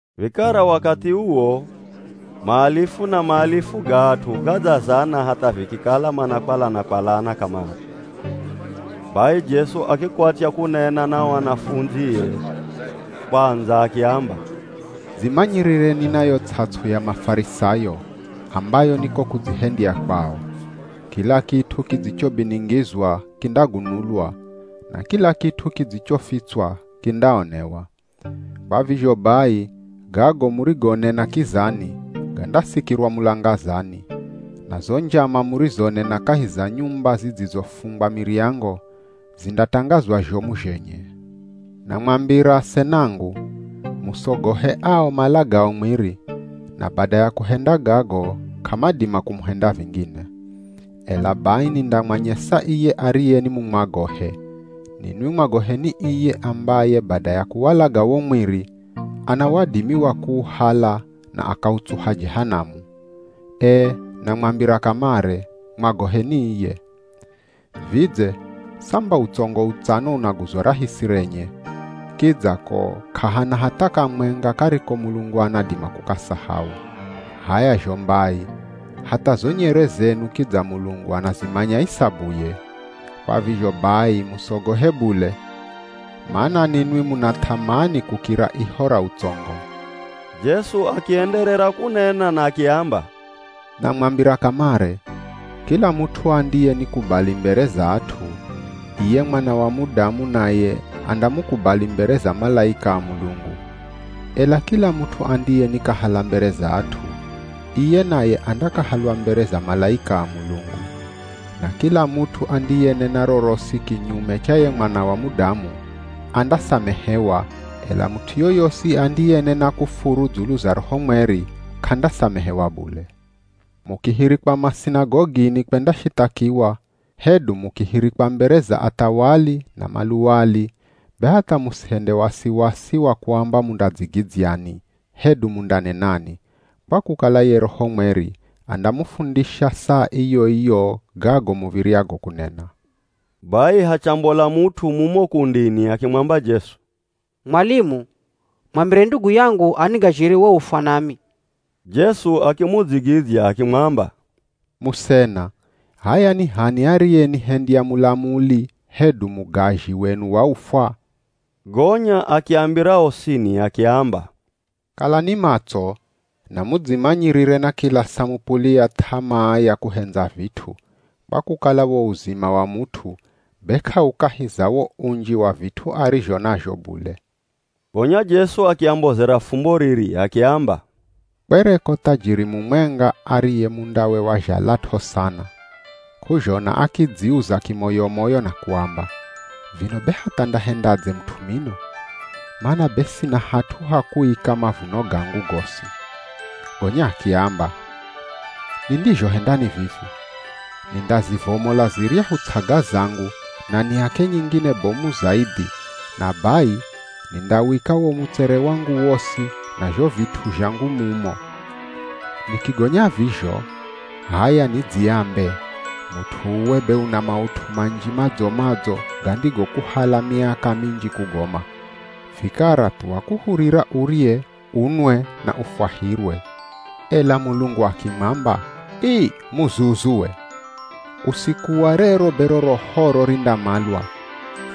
Vikara wakathi uwo maalifu na maalifu ga at'u gadzazana hatha vikikala manakwalana-kwalana kamare. Bai Jesu akikwatya kunena na o anafundzie kwandza akiamba, “Dzimanyirireni na yo ts'ats'u ya Mafarisayo ambayo ni ko kudzihendya kwao. Kila kit'u kidzichobiningizwa kindagunulwa, na kila kit'u kidzichofitswa kindaonewa. Kwa vizho bai gago murigonena kizani, gandasikirwa mulangazani, na zo njama murizonena kahi za nyumba zidzizofungwa miryango, zindatangazwa zhomu zhenye.” “Namwambira asenangu, musogohe ao malagao mwiri, na bada ya kuhenda gago, k'amadima kumuhenda vingine. Ela bai nindamwanyesa iye ariye ni mumwagohe: Ninwi mwagoheni iye ambaye bada ya kuwalaga wo mwiri ana wadimi wa kuuhala na akautsuha Jehanamu. Ee, namwambira kamare, mwagoheni iye! “Vidze samba utsongo utsano unaguzwa rahisi renye, kidza ko k'ahana hatha kamwenga kariko Mulungu anadima kukasahau. H'aya zho mbai, hatha zo nyere zenu kidza Mulungu anazimanya isabuye. Kwa vizho bai musogohe bule, mana ninwi muna th'amani kukira iho ra utsongo!” Jesu akienderera kunena na akiamba, “Namwambira kamare, kila mut'u andiyenikubali mbere za at'u, iye Mwana wa Mudamu naye andamukubali mbere za malaika a Mulungu. Ela kila mut'u andiyenikahala mbere za at'u, iye naye andakahalwa mbere za malaika a Mulungu. Na kila mut'u andiyenena rorosi kinyume cha ye Mwana wa Mudamu, andasamehewa, ela mut'u yoyosi andiyenena kufuru dzulu za Roho Mweri, k'andasamehewa bule. Mukihirikwa masinagogini kwendashithakiwa, hedu mukihirikwa mbere za athawali na maluwali, be hatha musihende wasiwasi wa kuamba mundadzigidzyani hedu mundanenani, kwa kukala ye Roho Mweri andamufundisha saa iyo-iyo gago muv̱iryago kunena.” Bai hachambola mut'u mumo kundini akimwamba Jesu, “Mwalimu, mwambire ndugu yangu anigazhire wo ufwa nami!” Jesu akimudzigidzya akimwamba, “Musena, h'aya ni h'ani ariyenihendya mulamuli hedu mugazhi wenu wa ufwa?” Gonya akiambira osini akiamba, “Kalani matso, na mudzimanyirire na kila samupuli ya th'amaa ya kuhendza vit'u, kwa kukala wo uzima wa mut'u be k'aukahi za wo unji wa vit'u arizho nazho bule.” Gonya Jesu akiambozera fumbo riri, akiamba, “Kwereko thajiri mumwenga ariye mundawe wazhalat'o sana. K'uzhona akidziuza kimoyo-moyo na kuamba, ‘Vino be hatha ndahendadze mut'u mino? Mana be sina hat'u ha kuika mavuno gangu gosi.’ Gonya akiamba, ‘Nindizhohenda ni vivi, nindazivomola ziryahu ts'aga zangu na niake nyingine bomu zaidhi na bai nindawika wo mutsere wangu wosi na zho vit'u zhangu mumo.’ Nikigonya vizho, h'aya nidziambe, ‘Mut'u uwe be una maut'u manji madzo-madzo gandigokuhala miaka minji kugoma, vikara thuwa kuhurira urye, unwe na ufwahirwe.’ “Ela Mulungu akimwamba, ‘Ii muzuzu we! Usiku wa rero be rohoro, rindamalwa,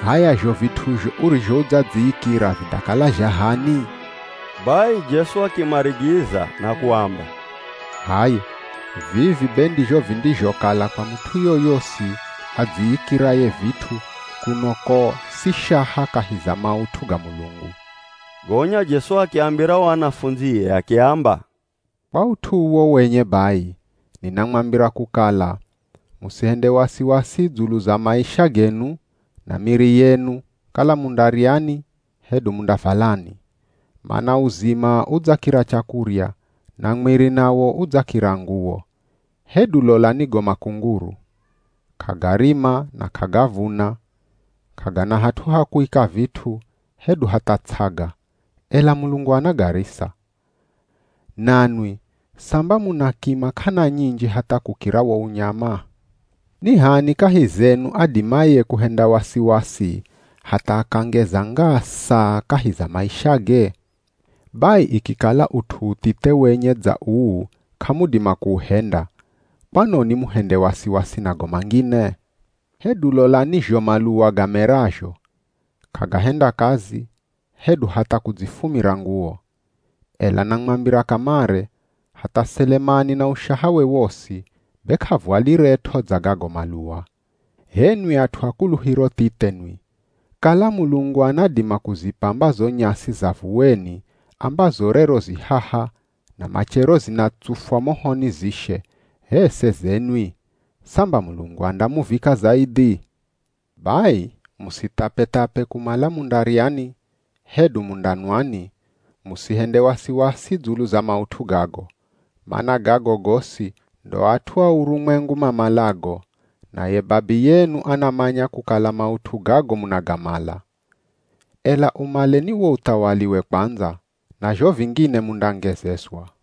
h'aya zho vit'uzho urizho udzadziikira vindakala zha h'ani?’” Bai Jesu akimarigiza na kuamba, “H'aya, vivi be ndizho vindizhokala kwa mut'u yoyosi adziikiraye vit'u kuno ko si shaha kahi za maut'u ga Mulungu.” Gonya Jesu akiambira o anafundzie akiamba, “Kwa ut'u uwo wenye bai, ninamwambira kukala, musihende wasiwasi dzulu za maisha genu, na miri yenu, kala mundaryani, hedu mundavalani. Mana uzima udzakira chakurya, na mwiri nawo udzakira nguwo. Hedu lolani go makunguru. K'agarima na k'agavuna, k'agana hat'u ha kuika vit'u, hedu hatha ts'aga, ela Mulungu anagarisa. Nanwi, samba muna kima k'ana nyinji hatha kukira wo unyama! Ni h'ani kahi zenu adimaye kuhenda wasiwasi hatha akangeza ngaa saa kahi za maishage? Bai ikikala ut'u uthithe wenye dza uu k'amudima kuuhenda, kwanoni muhende wasiwasi na go mangine? “Hedu lolani zho maluwa gamerazho, k'agahenda kazi, hedu hatha kudzifumira nguwo. Ela namwambira kamare, hatha Selemani na ushahawe wosi, be k'avwaliret'o dza gago maluwa. H'enwi at'u a kuluhiro thithe nwi! Kala Mulungu anadima kuzipamba zo nyasi za vuweni ambazo rero zi haha na machero zinatsufwa mohoni zishe, h'e seze nwi. Samba Mulungu andamuvika zaidhi? Bai musithapethape kumala mundaryani hedu mundanwani, musihende wasiwasi dzulu za maut'u gago. Mana gago gosi ndo at'u a urumwengu mamalago, naye Babiyenu anamanya kukala maut'u gago munagamala. Ela umaleni wo uthawaliwe kwandza, na zho vingine mundangezezwa.”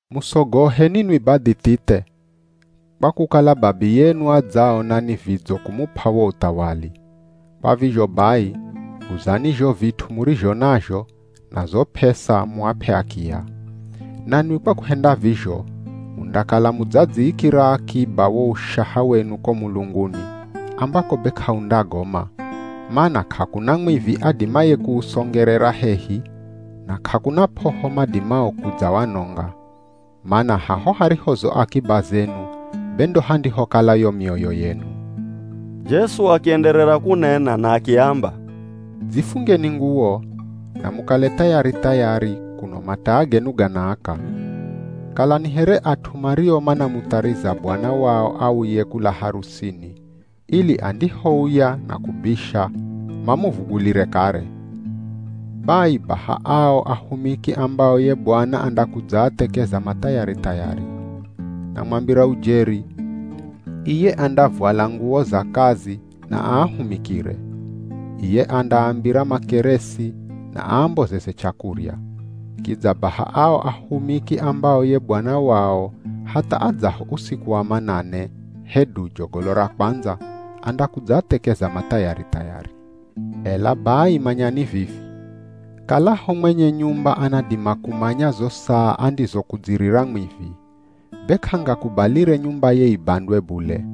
“Musogohe ninwi badhi thithe, kwa kukala Babiyenu adzaona ni vidzo kumup'a wo uthawali. Kwa vizho bai guzani zho vit'u murizho nazho, na zo p'esa muap'e akiya. Nanwi kwa kuhenda vizho, mundakala mudzadziikira akiba wo ushaha wenu ko mulunguni ambako be k'aundagoma, mana k'akuna mwivi adimaye kuusongerera hehi, na k'akuna p'oho madimao kudzawanonga. Mana haho hariho zo akiba zenu be ndo handihokala yo mioyo yenu.” Jesu akienderera kunena na akiamba, “Dzifungeni nguwo, na mukale thayari-thayari, kuno mataa genu ganaaka. Kalani here at'u mario manamuthariza bwana wao auye kula harusini, ili andihouya na kubisha, mamuvugulire kare. Bai baha ao ahumiki ambao ye bwana andakudzaathekeza mathayari-thayari. Namwambira ujeri, iye andavwala nguwo za kazi na aahumikire. Iye andaambira makeresi na aambozeze chakurya. Kidza baha ao ahumiki ambao ye bwana wao hatha adzaho usiku wa manane hedu jogolo ra kwandza andakudzaathekeza mathayari-thayari. Ela bai manyani vivi, kalaho mwenye nyumba anadima kumanya zo saa andizokudzirira mwivi, be k'angakubalire nyumbaye ibandwe bule,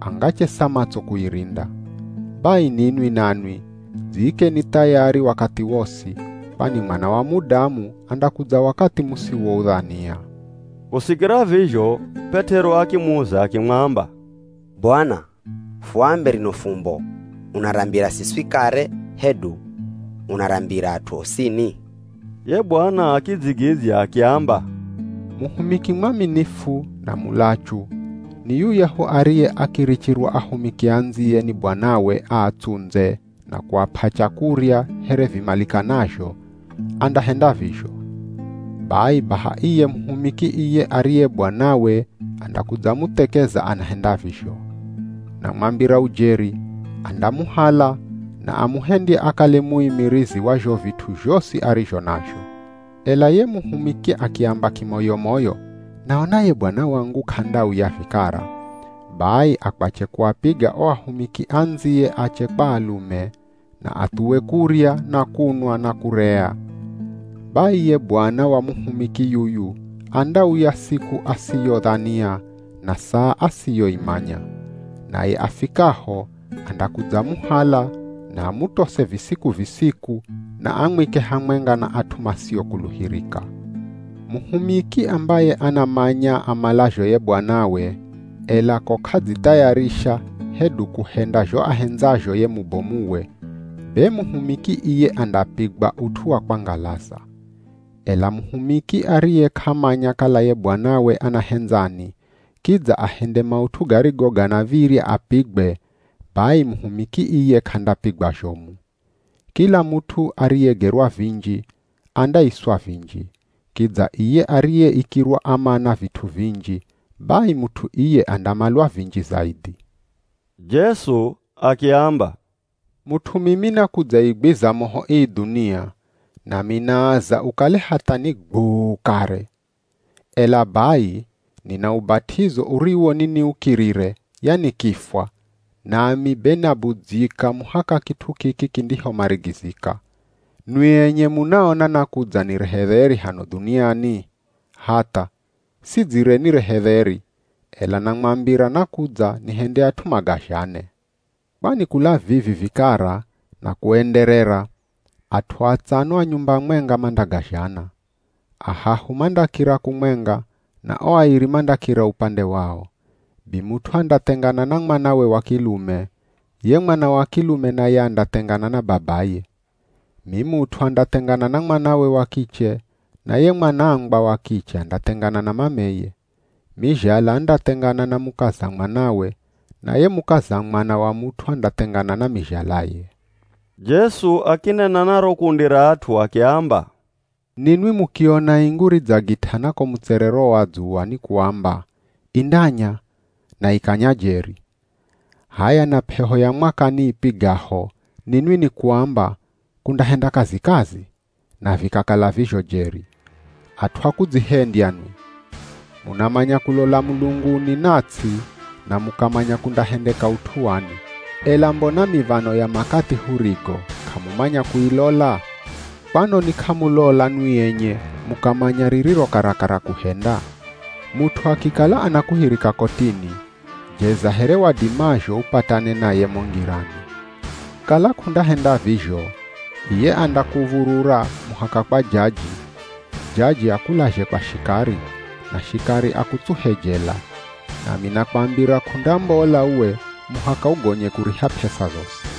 angachesa matso kuirinda. Bai ninwi nanwi dziikeni thayari wakathi wosi, kwani Mwana wa Mudamu andakudza wakathi musiwoudhania.” Kusikira vizho P'et'ero akimuza akimwamba, “Bwana, fuambe rino fumbo unarambira siswi kare, hedu unarambira at'u osini!” Ye Bwana akidzigidzya akiamba, “Muhumiki mwaminifu na mulachu ni yuyahu ariye akirichirwa ahumiki andziye ni bwanawe aatsundze na kuap'a chakurya here vimalikanazho, andahenda vizho. Bai baha iye muhumiki iye ariye bwanawe, andakudzamuthekeza anahenda vizho. Namwambira ujeri, andamuhala na amuhendye akale muimirizi wa zho vit'u zhosi arizho nazho. Ela ye muhumiki akiamba kimoyo-moyo, ‘Naona ye bwana wangu k'andauya vikara,’ bai akwache kuapiga o ahumiki andziye ache kwa alume, na athuwe kurya na kunwa na kurea. Bai ye bwana wa muhumiki yuyu andauya siku asiyodhania na saa asiyoimanya. Naye afikaho andakudzamuhala na amutose visiku-visiku na amwike hamwenga na at'u masiokuluhirika. Muhumiki ambaye anamanya amalazho ye bwanawe, ela ko k'adzithayarisha hedu kuhenda zho ahendzazho ye mubomuwe, be muhumiki iye andapigwa ut'u wa kwangalaza. Ela muhumiki ariye k'amanya kala ye bwanawe anahendzani, kidza ahende maut'u garigo ganav̱irya apigwe, bai muhumiki iye k'andapigwa zhomu. Kila mut'u ariyegerwa vinji, andaiswa vinji, kidza iye ariyeikirwa amana vit'u vinji, bai mut'u iye andamalwa vinji zaidhi.” Jesu akiamba, “Mut'u mimi nakudzaigwiza moho ii dhunia, nami naaza ukale hatha ni gwuu kare! Ela bai nina ubat'izo uriwo niniukirire, yani kifwa, nami be nabudzyika muhaka kit'u kiki kindihomarigizika! Nwi enye munaona nakudza nirehe dheri hano dhuniani? Hatha! Sidzire nirehe dheri, ela namwambira nakudza nihende at'u magazhane. Kwani kula vivi vikara na kuenderera at'u atsano a nyumba mwenga mandagazhana. Ahahu mandakira kumwenga na o airi mandakira upande wao. Bimut'u andathengana na mwanawe wa kilume, ye mwana wa kilume naye andathengana na babaye. Mimut'u andathengana na mwanawe wa kiche na ye mwanangwa wa kiche andathengana na mameye. Mizhala andathengana na mukaza mwanawe, na ye mukaza mwana wa mut'u andathengana na mizhalaye.” Jesu akinena na ro kundi ra at'u akiamba, “Ninwi mukiona ingu ridzagit'ana ko mutserero wa dzuwa nikuamba, ‘Indanya’ na ikanya jeri. H'aya, na p'eho ya mwakani ipigaho, ninwi nikuamba, ‘Kundahenda kazikazi,’ na vikakala vizho jeri. At'u a kudzihendya nwi! Munamanya kulola mulunguni na ts'i na mukamanya kundahendeka ut'u wani. Ela mbona miv̱ano ya makathi hurigo k'amumanya kuilola? “Kwanoni k'amulola nwi enye mukamanya ririro karakara kuhenda? Mut'u akikala anakuhirika kotini, jeza here wadimazho upatane naye mo ngirani. Kala k'undahenda vizho, iye andakuv̱urura muhaka kwa jaji, jaji akulazhe kwa shikari, na shikari akutsuhe jela. Nami nakwambira k'undambola uwe muhaka ugonye kuriha p'esa zosi.”